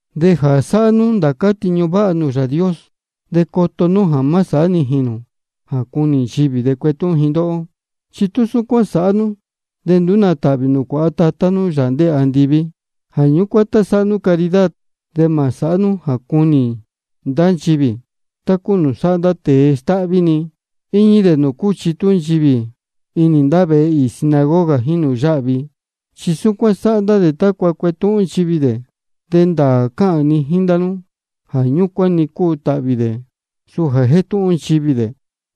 De jā sáhá nú ndācá tiñu váha nūū Yāā Dios, de coto nú jā má sāhá nijīn nū jā cunī nchivī de cuetúhún ji ndóhó. Chi tú súcuán sāhá nú, de nduú nā tāhvī nū cuāha maá Tatá nú, Yāā ndéē andiví. Jā ñúcuán tá sáhá nú caridad, de mā sāhá nú jā cunī ndá nchivī, tá cúu nūū sáhá ndá tēe stáhví-ni, íñí dē nūū cúchitú nchivī inī ndá vehe īī sinagoga jíín nūū yáhvi. Chi súcuán sáhá ndá dē tácua cuetúhún nchivī dē. De ndāā cáhān ni jíín ndá nú jā ñúcuán-ni cúu tāhvī dē, suu jā jétúhún nchivī dē.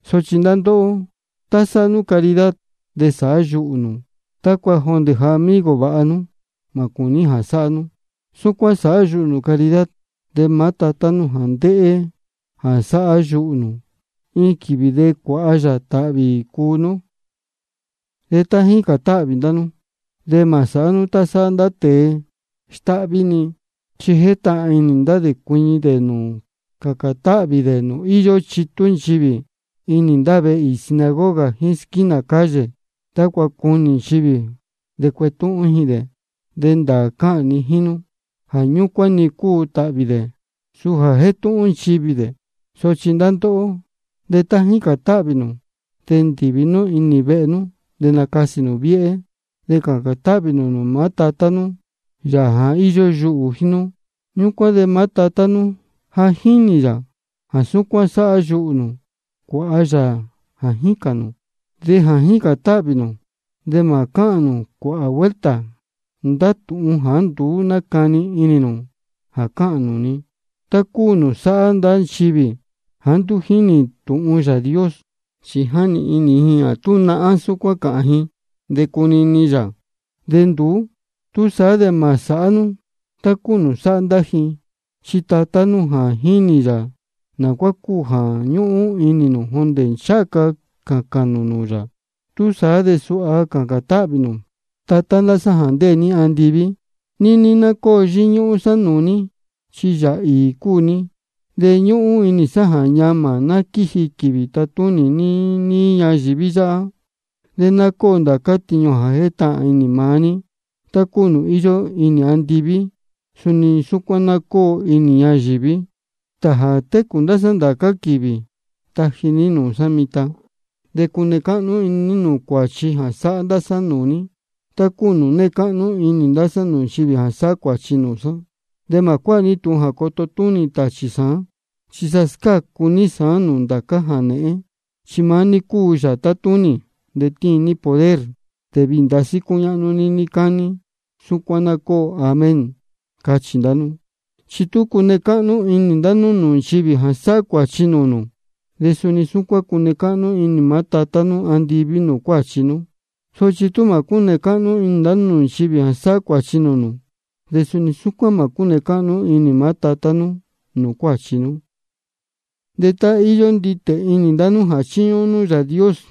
Sochi ndá ndóhó, tá sáhá nú caridad, de sāhá yuhū nū, tácua jondē amigo vāha nú mā cūní jā sáhá nú. Súcuán sāhá yuhū nū caridad. De maá Tatá nú jā ndéhé jā sáhá yuhū nū, iin quīvī de cuāha yā tāhvī cuu nú. De tá jícān táhvī ndá nú, de mā sāhá nú tá sáhá ndá tēe stáhví-ni. Chi jétahān inī ndá dē cuiñi dē cācān táhvī dē nūū íyó chitú nchivī inī ndá vehe īī sinagoga jíín squínā calle, tácua cunī nchivī de cuetúhún ji dē. De ndāā cáhān ni jíín nú jā ñúcuán-ni cúu tāhvī dē, suu jā jétúhún nchivī dē. Sochi ndá ndóhó, de tá jícān táhvī nū, de ndīvi nú inī vehe nú de nacasī nū viéhé. De cācān táhvī nū nūū maá Tatá nú, Yāā jā íyó yuhū jíín nú. Ñúcuán de maá Tatá nú jā jínī yā jā súcuán sáhá yuhū nū, cuāha yā jā jícān nū. De jā jícān táhvī nū, de mā cáhān nū cuāhā vuelta ndá tūhun jāá nduú nácani inī nū de cáhān nū-ni, tá cúu nūū sáhá ndá nchivī jāá nduú jínī tūhun Yāā Dios. Chi jáni inī ji jā tú nahán súcuán cáhān ji, de cunini yā, de nduú. Túsaá de mā sāhá nú tá cúu nūū sáhá ndá ji. Chi maá Tatá nú ja jínī yā naá cúu jā jíni ñúhún nú jondē ncháha ca cācān nū nūū yā. Túsaá de suha cācān táhvī ndá nú: Tatá ndá sá jā ndéē ní andiví, níní ná cóo yíñúhún sá nūū ní, chi Yāā īī cúu ní. De ñúhún inī sá jā ñamā ná quíji quīvī tatúnī ní níí ñayīví yáhá. De ná cóo ndācá tiñu jā jétahān inī maá ní, tá cúu nūū íyó inī andiví, suni súcuán ná cóo inī ñayīví. Stāā jā técū ndá sá ndācá quīvī, taji ní nūū sá mitan. De cune cáhnú inī ní nūū cuāchi jā sáhá ndá sá nūū ní, tá cúu nūū née cáhnú inī ndá sá nūū nchivī jā sáhá cuāchi nūū sá. De mā cuáha ní tūhun jā coto túnī tāchī sāán, chi sa scácu ní sāán nūū ndācá jānēhén. Chi maá ní cúu Yāā tátúnī, de tíin ní poder, de viī ndasí cúñáhnú ní níí cání. Súcuán ná cóo. Amén. Cachī ndá nú. Chi tú cune cáhnú inī ndá nú nūū nchivī jā sáhá cuāchi nūū nū, de suni súcuán cune cáhnú inī maá Tatá nú andiví nūū cuāchi nú. Sochi tú mā cúne cáhnú inī nū nūū nchivī jā sáhá cuāchi nūū nū, de suni súcuán mā cúne cáhnú inī maá Tatá nú nūū cuáchi nú. De tá íyó nditē inī ndá nú jā chíñúhún nú Yāā Dios,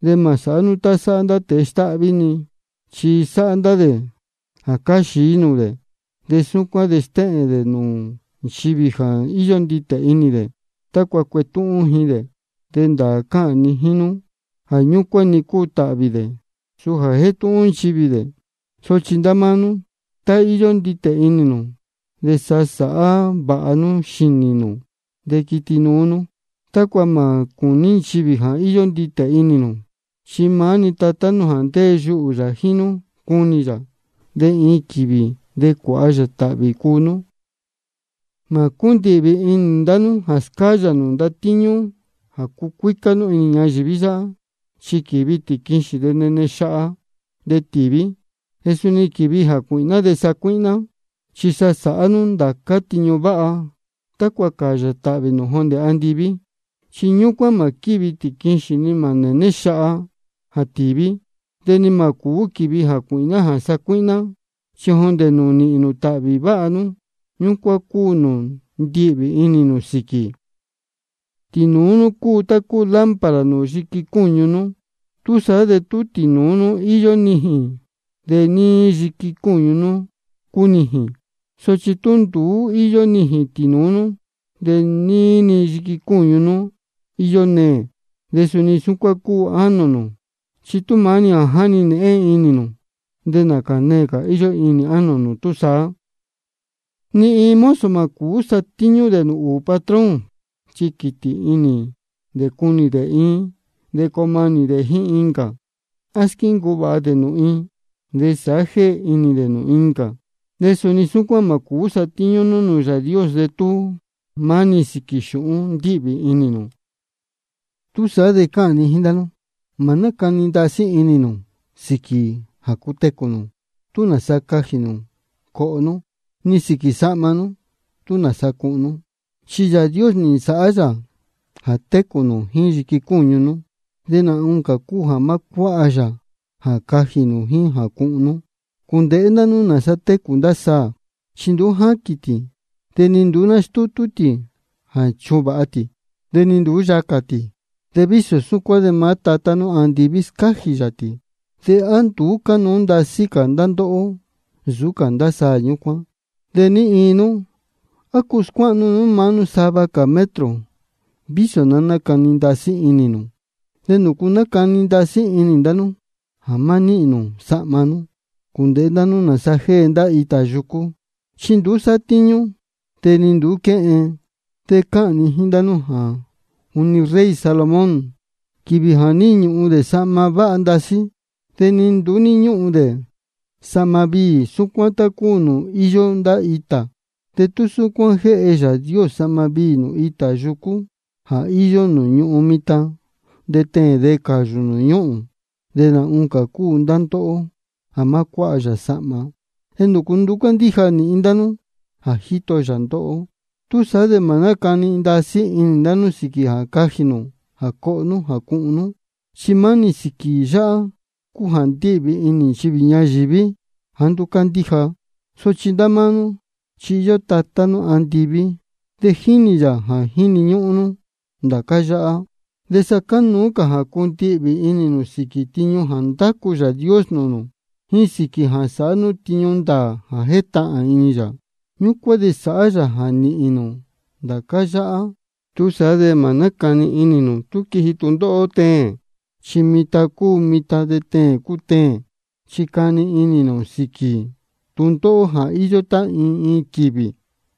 de mā sāhá nú tá sáhá ndá tēe stáhví-ni. Chi sáhá ndá dē jā cáá xií nūū dē, de súcuán de stéhēn dē nūū nchivī jā íyó nditē inī dē, tácua cuetúhún ji dē. De ndāā cáhān ni jíín nú jā ñúcuán-ni cúu tāhvī dē, suu jā jétúhún nchivī dē. Sochi ndá máá nú, tá íyó nditē inī nū de sa nasāhá vāha nú xīnī nū de quiti nuú nú, tácua mā cūní nchivī jā íyó nditē inī nū. Chi maá-ni Tatá nú jā ndéē yuhū yā jíín nú, cunī yā, de iin quīvī de cuāha yā tāhvī cuu nú. Mā cúndihvī inī ndá nú jā scáyā nū ndatíñú jā cucuícá nú inī ñayīví yáhá, chi quívi tīquixīn, de néne xaha, de tíví. De suni quívi jācuīhná de sácuíhná. Chi sa sāhá nú ndācá tiñu váha tácua cāyā tāhvī nū jondē andiví. Chi ñúcuán mā quívi tīquixīn ni mā nēné xaha jā tīví, de ni mā cūú quīvi jācuīhná jā sacuíhná. Chi jondē nūū nīhīn nū tāhvī váha nú, ñúcuán cúu nūū ndíhvī inī nū sīquī. Tīnūú nú cúu tá cúu lámpara nūū yiqui cúñu nú. Túsaá de tú tīnūú nú íyó nijīn, de níí-ni yiqui cúñu nú cunijīn. Sochi tú nduú íyó nijīn tīnūú nú, de níí-ni yiqui cúñu nú íyó neē. De suni súcuán cúu ánō nū, chi tú maá-ni jā jáni nēhén inī nū, de nācā neē cā íyó inī ánō nū túsaá. Ni iin mozo mā cūú satíñú dē nūū ūū patrón. Chi quītī inī dē cunī dē iin de coo manī dē jíín incā, á squíncuu vāha dē nūū iin de sāhá jéhe inī dē nūū incā. De suni súcuán mā cūú satíñú nú nūū Yāā Dios de tú maá-ni sīquī xūhún ndíhvī inī nū. Túsaá de cáhān ni jíín ndá nú: Mā nácani ndasí inī nū sīquī jā cutecū nū, tú nāsa cajī nū coho nú, ni sīquī sahma, tú nāsa cuhun nú. Chi Yāā Dios nī nsāhá yā jā técū nū jíín yiqui cúñu nú, de nā oncā cúu jā má cuáha yā jā cajī nū jíín jā cuhun nú. Cūndēhé ndá nú nāsa técū ndá saā, chi nduú jáquīn tī, de nduú nástútú tī jā chuvāha tī, de ni nduú yacā tī. De vísō súcuán de maá Tatá nú andiví scájī yā tī. ¿De á nduú cánuú ndasí cā ndá ndóhó nsūú cā ndá saā ñúcuán? ¿De ní iin nú, á cuu scuáhnu nú maá nú sava metro cā, vísō ná nácani ndasí inī nū? ¿De nūcu nácani ndasí inī ndá nú jā má níhīn nū sahma? Cūndēhé ndá nú nāsa jée ndá itā yucú. Chi nduú sátíñú, de ni nduú quéhen. De cáhān ni jíín ndá nú jā juni rey Salomón, quīvī jā ní ñūhun dē sahma váha ndasí, de ni nduú ní ñúhún dē sahma viī súcuán tá cúu nūū íyó ndá itā. De tú súcuán jéhe Yāā Dios sahma viī nūū itā yucú jā íyó nūū ñūhún mitan de teēn de cayū nūū ñúhūn, de nā oncā cúu ndá ndóhó jā má cuáha yā sahma. ¿De nūcu nduú cándíja nīhin ndá nú jā jíto yā ndóhó? Túsaá de mā nácani ndasí inī nū sīquī jā cajī nū, jā coho nú, jā cuhun nú. Chi maá-ni sīquī yáhá cúu jā ndíhvī inī nchivī ñayīví jāá nduú cándíja. Sochi ndá máá nú, chi íyó Tatá nú andiví, de jínī yā jā jíni ñúhún nú ndācá yáhá. De sa cánuú cā jā cundihvī inī nū sīquī tiñu jā ndácu Yāā Dios nūū nū, jíín sīquī jā sāhá nú tiñu ndāā jā jétahān inī yā. Ñúcuán de sāhá yā jā nīhīn nū ndācá yáhá. Túsaá de mā nácani inī nū tú quiji tūndóhó teēn, chi mitan cúu mitan de teēn cúu teēn. Chi cani inī nū sīquī tūndóhó jā íyó tá iin iin-ni quīvī.